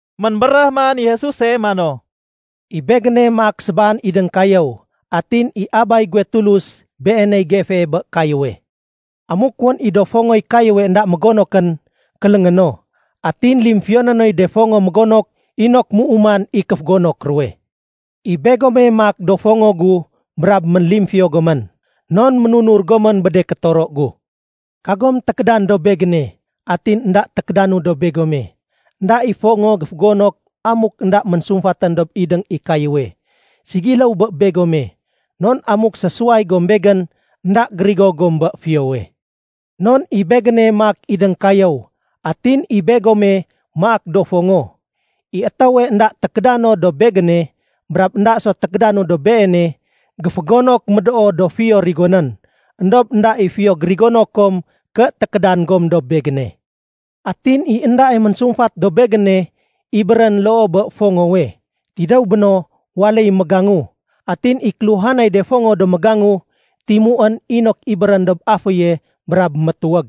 Ménbéréh man i Jesuse mano, “I Begéne maak sébaan idéng kayéw atin i Abay guwe Tulus Beeney gefee bé kayéwe. Amuk wén i do fongoy kayéwe énda mégonokén, kéléngé no. Atin limfiyoné noy de fongo mégonok inok méuman i kéfégonok ruwe. I begome maak do fongo gu brab ménlimfiyo gomén, non ménunur gomén bé de kétoro gu. Kagom tékédan dob Begéne atin énda tékédanu dob begome. Enda i fongo géfégonok amuk énda ménsumfatén dob idéng i kayéwe. Ségiléw bé begome non amuk sésuway gom Begén, énda gérigo gom bé fiyowe. “Non i Begéne maak idéng kayéw atin i begome maak do fongo. I étéwe énda tékédan no dob Begéne, brab énda so tékédanu dob beene, géfégonok médoo do fiyo rigonén. Endob énda i fiyo gérigono kom ké tékédan gom dob Begéne. Atin i endae ménsumfat dob Begéne ibérén loo bé fongowe. Tidéw béno, waléy mégangu. Atin i kéluhanay de fongo do mégangu, timuén inok ibérén dob aféye brab métuwég.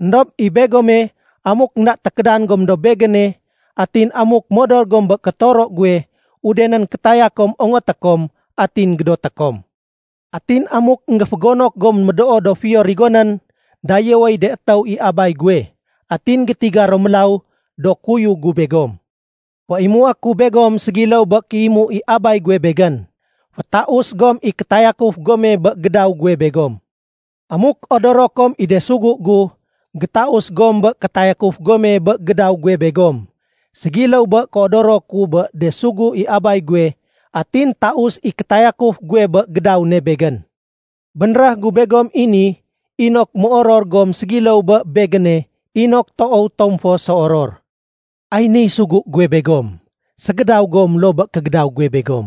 Endob i begome, amuk énda tékédan gom dob Begéne atin amuk modor gom bé kétoro guwe, udenén kétaya kom ongoté kom, atin gédoté kom. Atin amuk énggéfégonok gom médoo do fiyo rigonén, dayéwéy de étéw i Abay guwe. Atin gétiga ro mélaw do kuyug gu begom. Féimué ku begom ségiléw bé kéimu i Abay guwe Begén. Fétaus gom i kétayakuf gome bé gédaw guwe begom. Amuk odoro kom i de sugu gu, gétaus gom bé kétayakuf gome bé gédaw guwe begom, ségiléw bé kéodoro ku bé de sugu i Abay guwe atin taus i kétayakuf guwe bé gédaw ne Begén. “Bénréh gu begom i ni inok méoror gom ségiléw bé Begéne inok toow tom fo séoror. Ay niy sugu guwe begom: ségédaw gom loo bé kégédaw guwe begom.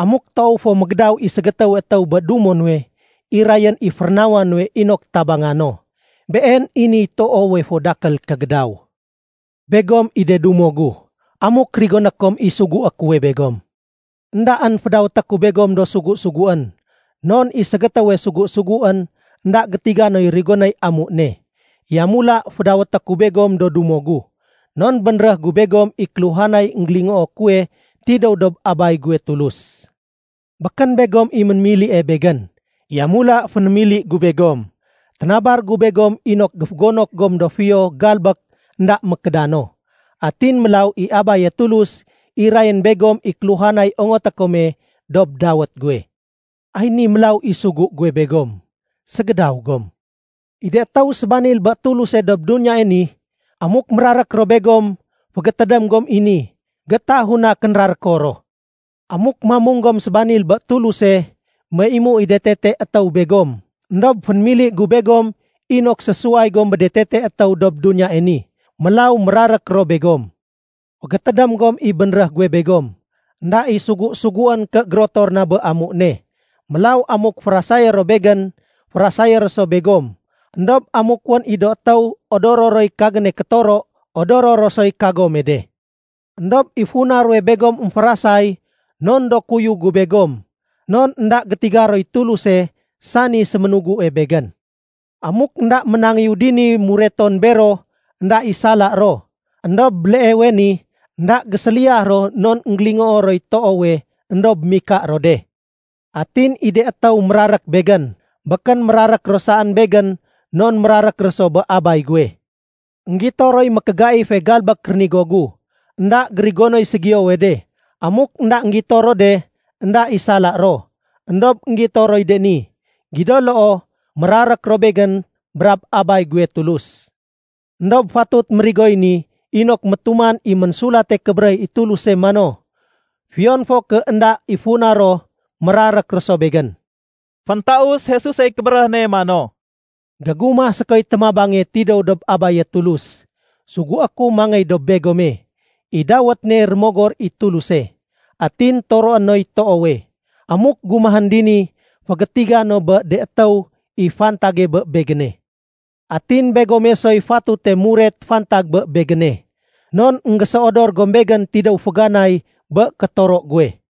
Amuk toow fo mégédaw i ségétéwe étéw bé dumo nuwe, irayén i férénawa nuwe inok tabanga no. Been i niy toowe fo dakél kégédaw. Begom i do dumo gu, amuk rigoné kom i sugué kuwe begom. Endaén fédawété ku begom do sugu-suguén, non i ségétéwe sugu-suguén, énda gétiga noy rigonéy amu ne. Yamula fédawété ku begom do dumo gu, non bénréh gu begom i kéluhanay énggélingoo kuwe tidéw dob Abay guwe Tulus. Békén begom i ménémilie Begén, yamula fénémili gu begom. Ténabar gu begom inok géfégonok gom do fiyo galbék énda mékédano. Atin mélaw i Abaye Tulus, irayén begom i kéluhanay ongoté kome dob dawét guwe. Ay ni mélaw i sugu guwe begom: ségédaw gom. “I de étéw sébanil bé Tuluse dob duniyae ni, amuk mérarék ro begom, fégétédém gom i ni, géétahu na kénraréko ro. Amuk mamung gom sébanil bé Tuluse, méimu i de tete étéw begom. Endob fénémili gu begom inok sésuway gom bé de tete étéw dob duniyae ni. Mélaw mérarék ro begom. Fégétédém gom i bénréh guwe begom, ‘Enda i sugu-suguén ké gérotor na bé amu ne.’ Mélaw amuk férasayé ro Begén, férasayé ro so begom. Endob amuk wén i do étéw odoro roy kagéne kétoro, odoro ro soy kagome de. Endob i funa ruwe begom émférasay non do kuyug gu begom. Non énda gétiga roy Tuluse, sani séménugue Begén. Amuk énda ménangéyu dini mureton bero, énda i sala ro. Endob béleewe ni énda géséliyah ro non énggélingoo roy toowe, éndob mika ro de. Atin i de étéw mérarék Begén, békén mérarék ro saén Begén non mérarék ro so bé Abay guwe. Enggito roy mékégaife galbék rénigo gu, énda gérigonoy ségiyowe de. Amuk énda énggito ro de, énda i sala ro. Endob énggito roy de ni, gido loo mérarék ro Begén brab Abay guwe Tulus. Endob fatut mérigoy ni inok métuman i Ménsulate Kébéréh i Tuluse mano, ‘Fiyon fo ké énda i funa ro, mérarék ro so Begén.’” Féntaus Jesusey kébéréh ne mano, “Gégumah sékoy témabange tidéw dob Abaye Tulus. Sugué ku mangéy dob begome. I dawét ne Rémogor i Tuluse, atin toroé noy toowe. Amuk gumahén dini, fégétiga no bé de étéw i fantage bé Begéne. Atin begome soy fatute muret fantag bé Begéne, non énggéséodor gom Begén tidéw féganay bé kétoro guwe.”